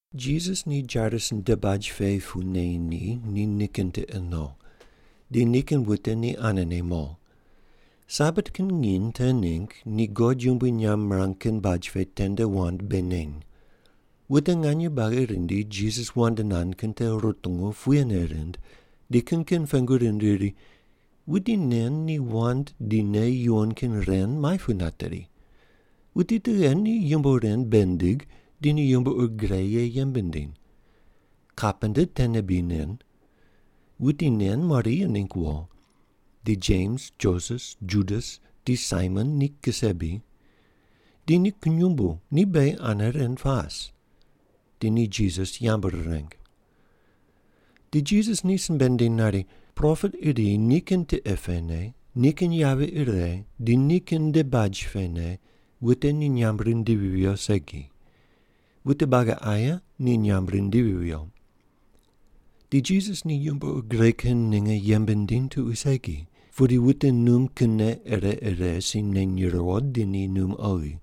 Jisas ni Jairus nde baj pe pu neyi ni nikin tiqe no. Di nikin wute ni anene mo. Sabat kin nginy te ningg ni God yumbui nyamb mirang kin baj pe tende wand bei neny. Wute nganye buagi rindi Jisas wand nand kin te rutungu puyene rind di kin kin pengu rind riri, “Wuti nen ni wand di nei yuwon kin ren muai pu nateri? Wuti tughe ni yumbo ren bei nindig di ni yumbo ur gre ye yembe nindiny? Kapenta tene bri nen? Wuti nen Maria ningg wo, di Jems, Joses, Judas di Saimon ni kise bri? Di ni kunyumbu ni beghi ane ren pas.” Di ni Jisas yambu rireng. Di Jisas ni simbe nindiny nari, “Propet iri nikin tiqe pene, nikin yavi ire di nikin nde baj pene wute ni nyamb rindivi viyo segi. Wute buagi aye ni nyamb rindivi viyo.” Di Jisas ni yumbo ur gre kin ninge yembe nindiny tuqui segi, pudi wute num kinne ire ire si neny riwo di ni num oghi.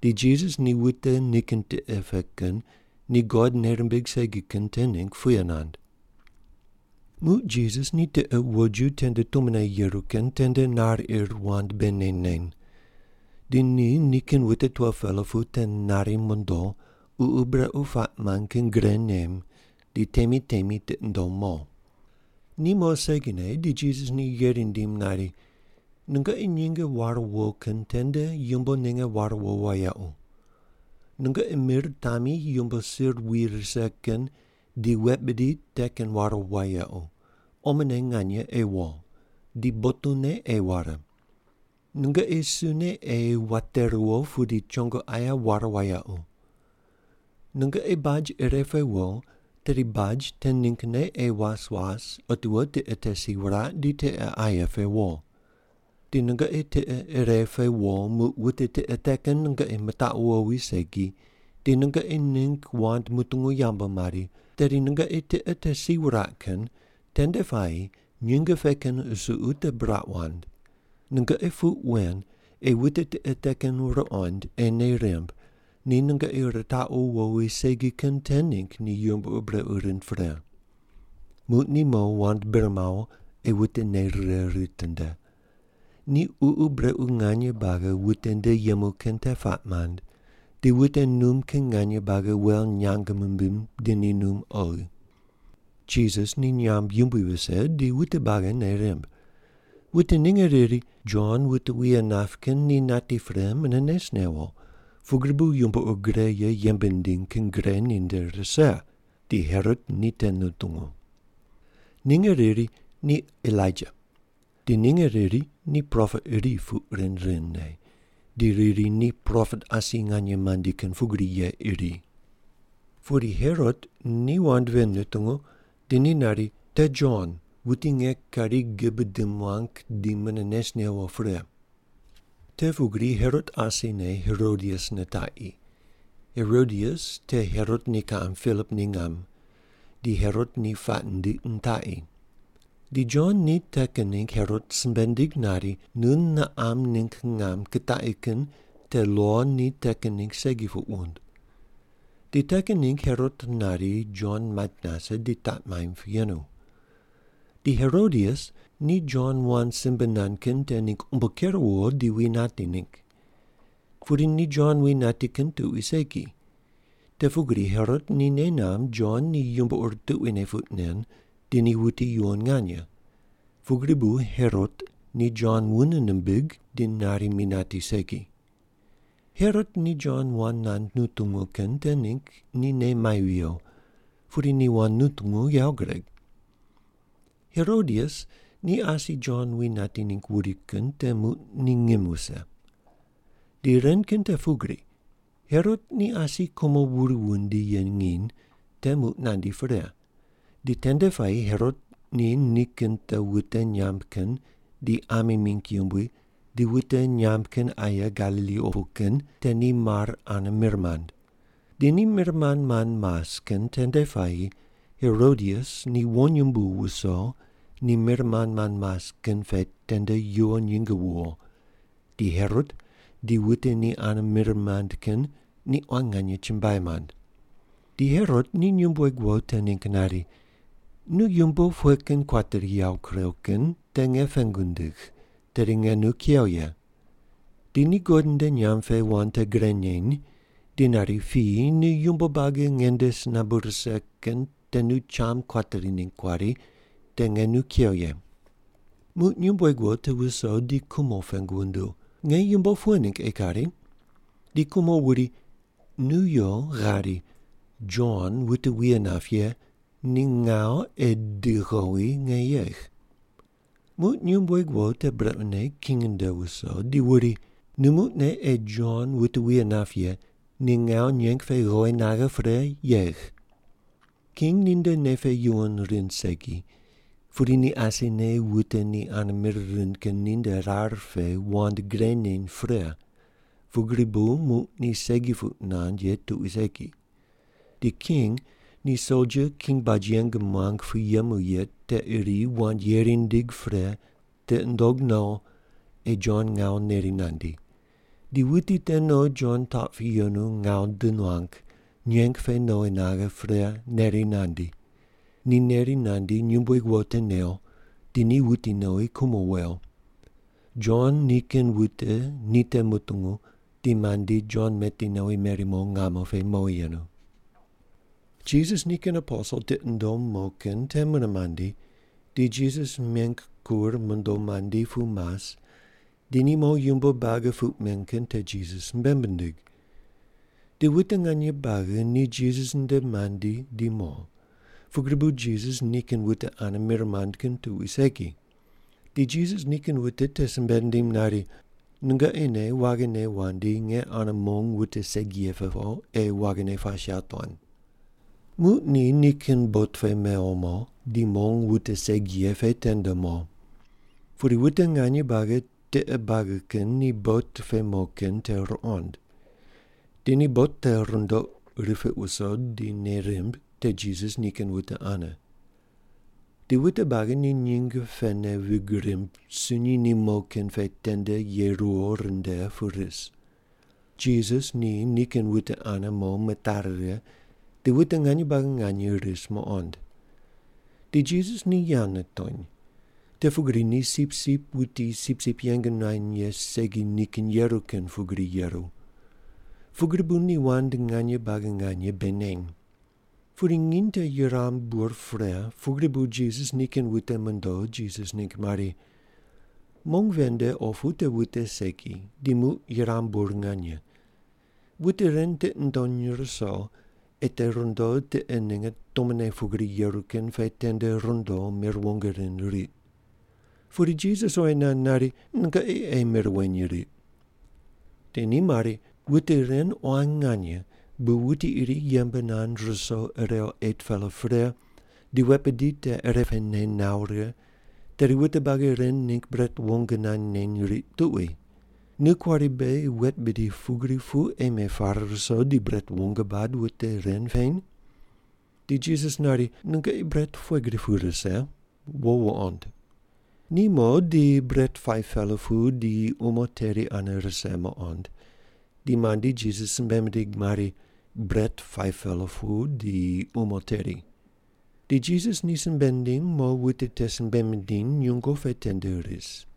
Di Jisas ni wute nikin tiqe pe kin ni God nei rimbig segi kin te ningg puye nand. Muq Jisas ni tiqe woju tende tumone yeru kin tende nar ir wand bei neny neny. Di ni nikin wute 12-pela pu te nari mondo, ququ brequ puaq mand kin gre nem di temi temi tiqi nundom mo. Ni mo segine di Jisas ni yeri nindim nari, “Nungoqi nyinge ware wo kin tende yumbo ninge ware wo wayequ. Nungoqi mir tami yumbo sir wi rise kin di wet bidi te kin ware wayequ, omone nganye ei wo. Di botune ei ware. Nungoqi sune ei wate riwo pudi chongo aye ware wayequ. Nungoqi baj ire pe wo tedi baj te ninggne ei was was otiwo tiqe te si wuraq di tiqe aye pe wo. Di nungoqi tiqe ire pe wo muq wute tiqe te kin nungoqi mitaqu wowi segi, di nungoqi ningg wand mutungu yambu mari, tedi nungoqi tiqe te si wuraq kin tende puayi nyinge pe kin qusuqu te buraq wand. Nungoqi puq wen ei wute tiqe te kin ruqond ei nei rimb ni nungoqi ritaqu wowi segi kin te ningg ni yumbo ur brequ rind pre.” Muq ni mo wand bir mawo ei wute nei rire ritinde. Ni ququ brequ nganye buagi wute nde yemu kin te puaq mand di wute num kin nganye buagi wel nyang mimbiny di ni num oghi. Jisas ni nyamb yumbui vise di wute buagi nei rimb. Wute ninge riri, “Jon wute wuye nap kin ni nati pre mune nes newo, pugri bu yumbo ur gre ye yembe nindiny kin gre ninde rise.” Di Herot ni te nutungu. Ninge riri, “Ni Elaija.” Di ninge riri, “Ni propet iri,” puq rind rindne, di riri ni propet asi nganye mandi kin pugri ye iri. Pudi Herot ni wand ven nutungu di ni nari, “Te Jon wuti nge kari gibe di muang kin ni mune nes newo pre!” Te pugri Herot asine Herodias nitaqi. Herodias te Herot ni kiqam Pilip ni ngam, di Herot ni puaq nindiq nitaqi. Di Jon ni te kin ningg Herot simbe nindig nari, “Nu niqam ningg ngam kutaqi kin te lo ni te kin ningg segi puq wund.” Di te kin ningg Herot nari Jon mait nase di taq maimb pu yenu. Di Herodias ni Jon wand simbe nand kin te ningg umbo ker wuwo di wi nati ningg. Pudi ni Jon wi nati kin tuqui segi, te pugri Herot ni nei namb Jon ni yumbo ur tuquine puq nen di ni wuti yuwon nganye, pugri bu Herot ni Jon wune nimbig di nari mi nati segi. Herot ni Jon wand nand nutungu kin te ningg ni nei mai viyo, pudi ni wand nutungu yawo gureg. Herodias ni asi Jon wi nati ningg wuri kin te muq ni ngim wuse. Di ren kin te pugri: Herot ni asi kumo wuri wundi ye nginy te muq nandi pre, di tende puayi Herot ni nikin te wute nyamb kin di ami mingg yumbui di wute nyamb kin aye Galili opu kin te ni mar ane mir mand. Di ni mir mand mand mas kin tende puayi Herodias ni wonyumbu wuso ni mir mand mand mas kin pe tende yuwo nyinge wuwo di Herot di wute ni ane mir mand kin ni quan nganye chumbuai mand. Di Herot ni nyumbueg wo te ningg nari, “Nu yumbo pughe kin kuateri yawo kurew kin te nge pengu ndigh, tedi nge nu kew ye.” Di ni God nde nyamb pe wand te gre neny di nari, “Piyi nu yumbo buagi nge nde si nambu rise kin te nu cham kuateri ningg kuari, te nge nu kew ye.” Muq nyumbueg wo te wuso di kumo pengu wunduw, “Nge yumbo pughe ningg ei kari?” Di kumo wuri, “Nu yo ghari ‘Jon wute wuye nap ye ni ngawu ei di ghowi nge yegh’.” Muq nyumbueg wo te brequne king nde wuso di wuri, “Nu muqne ei Jon wute wuye nap ye ni ngawu nyeng pe ghowi naghe pre yegh.” King ninde nei pe yuwon rind segi pudi ni asine wute ni ane mir rind kin ninde rar pe wand gre neny pre pugri bu muq ni segi puq nand ye tuqui segi. Di king ni soldia king baj yeng muang pu yemu ye te iri wand yeri nindig pre tiqi nundog no ei Jon ngawu neri nandi. Di wuti te no Jon taq pune yenu ngawu di nuang, nyeng pe nowi naghe pre neri nandi. Ni neri nandi nyumbueg wo te new di ni wuti nowi kumo wew. Jon nikin wute ni te mutungu di mandi Jon meti nowi meri mo ngamo pe mowi yenu. Jisas nikin aposel tiqi nundom mo kin te mune mandi di Jisas meng kur mondo mandi pu mas di ni mo yumbo buagi puq men kin te Jisas simbe mindig. Di wute nganye buagi ni Jisas nde mandi di mo, pugri bu Jisas nikin wute ane mir mand kin tuqui segi. Di Jisas nikin wute te simbe nindim nari, “Nungoqi ne waghine wandi nge ane mong wute segi ye pe po ei waghine pas yawotuan.” Muq ni nikin bot pe mewo mo di mong wute segi ye pe tende mo. Pudi wute nganye buagi tiqe buagi kin ni bot pe mo kin te ruqond. Di ni bot te rundoq ripiq wuso di nei rimb te Jisas nikin wute ane. Di wute buagi ni nyinge pene vig rimb sunyi ni mo kin pe tende ye ruwo rinde pu ris. Jisas ni nikin wute ane mo mitari righe di wute nganye buagi nganye ris muqond. Di Jisas ni yawo nitony, te pugri ni sipsip wuti sipsip yeng nuany ye segi nikinne yeru kin pugri yeru. Pugri bu ni wand nganye buagi nganye bei neny. Pudi nginy te yuram bur pre pugri bu Jisas nikin wute mondo Jisas ningg mari, “Mong ven nde opu te wute segi, di muq yuram bur nganye. Wute ren tiqi ndony ruso, ei te rundo tiqe ninge tumone pugri yeru kin pe tende rundo mir wong rind riq.” Pudi Jisas oyi nand nari, “Nungoqi ei mir weny riq.” Di ni mari, “Wute ren quan nganye bu wuti iri yembe nand ruso irew 8-pela pre di wet bidi te irepene nawo righe, tedi wute buagi ren ningg bret wong nand neny riq tuqui. Nu kuari beghi wet bidi pugri pu ei mepare ruso di bret wong bad wute ren peny?” Di Jisas nari, “Nungoqi bret pughe gri pu rise? Wo wuqond.” Ni mo di bret 5-pela pu di umo teri ane rise muqond di mandi Jisas simbe mindig mari, “Bret 5-pela pu di umo teri.” Di Jisas ni simbe nindim mo wute te simbe mindiny nyungo pe tende ris.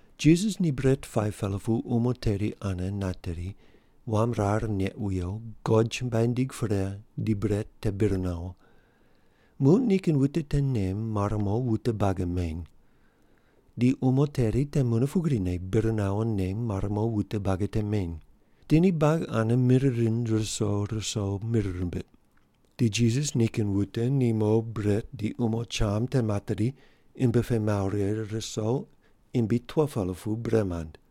Jisas ni bret 5-pela pu umo teri ane nateri, wam rar neq wiyo, God chumbuai nindig pre di bret te bir nawo. Muq nikin wute te nem mare mo wute buagi meny. Di umo teri te mune pugrine bir nawo nem mare mo wute buagi te meny. Di ni buagi ane mir rind ruso ruso mir rimbiq. Di Jisas nikin wute ni mo bret di umo cham te materi imbi pe mawo righe ruso imbi 12-pela pu bre mand.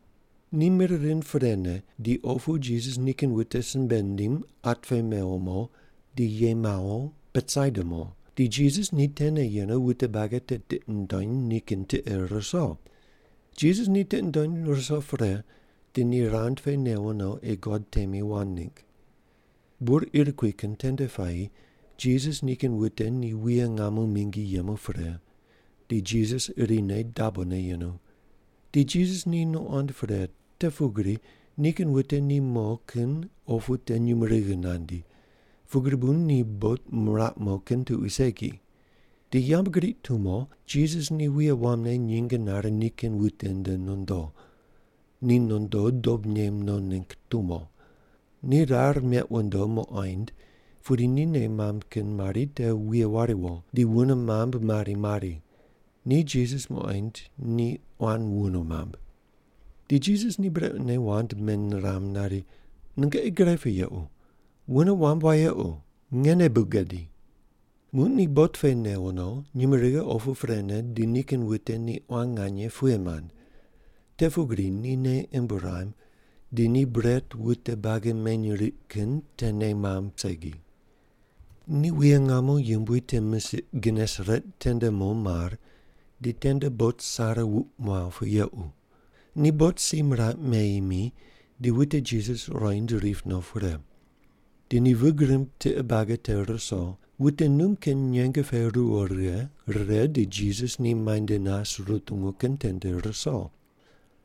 Ni mir rind prene di opu Jisas nikin wute simbe nindim at pe mewo mo di ye mawo Betsaida mo, di Jisas ni tene yenu wute buagi te tiqi nundony nikin tiqe ruso. Jisas ni tiqi nundony ruso pre, di ni rand pe newo no ei God temi wand ningg. Bur ir kui kin tende puayi Jisas nikin wute ni wuye ngamo mingi yemu pre, di Jisas irine dabone yenu. Di Jisas ni nuqond pre te pugri nikin wute ni mo kin opu te nyumurighi nandi, pugri bu ni bot miraq mo kin tuqui segi. Di yambgriq tumo Jisas ni wuye wamne nyinge nare nikin wute nde nondo. Ni nondo dob nem no ningg tumo. Ni rar meq wundo muqoind pudi ni nei mamb kin mari te wuye wariwo, di wune mamb mari mari. Ni Jisas muqoind di quan wune mamb. Di Jisas ni brequne wand meniram nari, “Nungoqi gre pu yequ. Wune wamb wayequ, ngene bu gadi.” Muq ni bot pe newo no, nyumurighi opu prene di nikin wute ni quan nganye puye mand. Te pugri ni nei imb ruam di ni bret wute buagi meny riq kin te nei mamb segi. Ni wuye ngamo yumbui te misiq Genesaret tende mo mar di tende bot sare wuq muaw pu yequ. Ni bot si miraq meyi mi di wute Jisas ruqoind rip no pre. Di ni vig rimb tiqe buagi te ruso wute num kin nyembe pe ruwo righe rire di Jisas ni muainde nas rutungu kin tende ruso.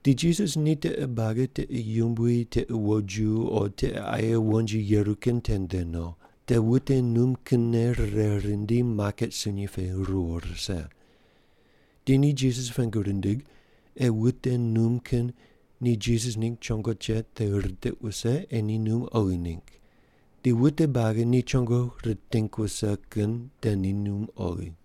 Di Jisas ni tiqe buagi tiqe yumbui tiqe woju o tiqe aye wonji yeru kin tende no, te wute num kinne rire rindi maket sunyi pe ruwo rise. Di ni Jisas pengu rindig ei wute num kin ni Jisas ningg chongo cheq te ritiq wuse ei ni num oghi ningg. Di wute buagi ni chongo riting wuse kin te ni num oghi.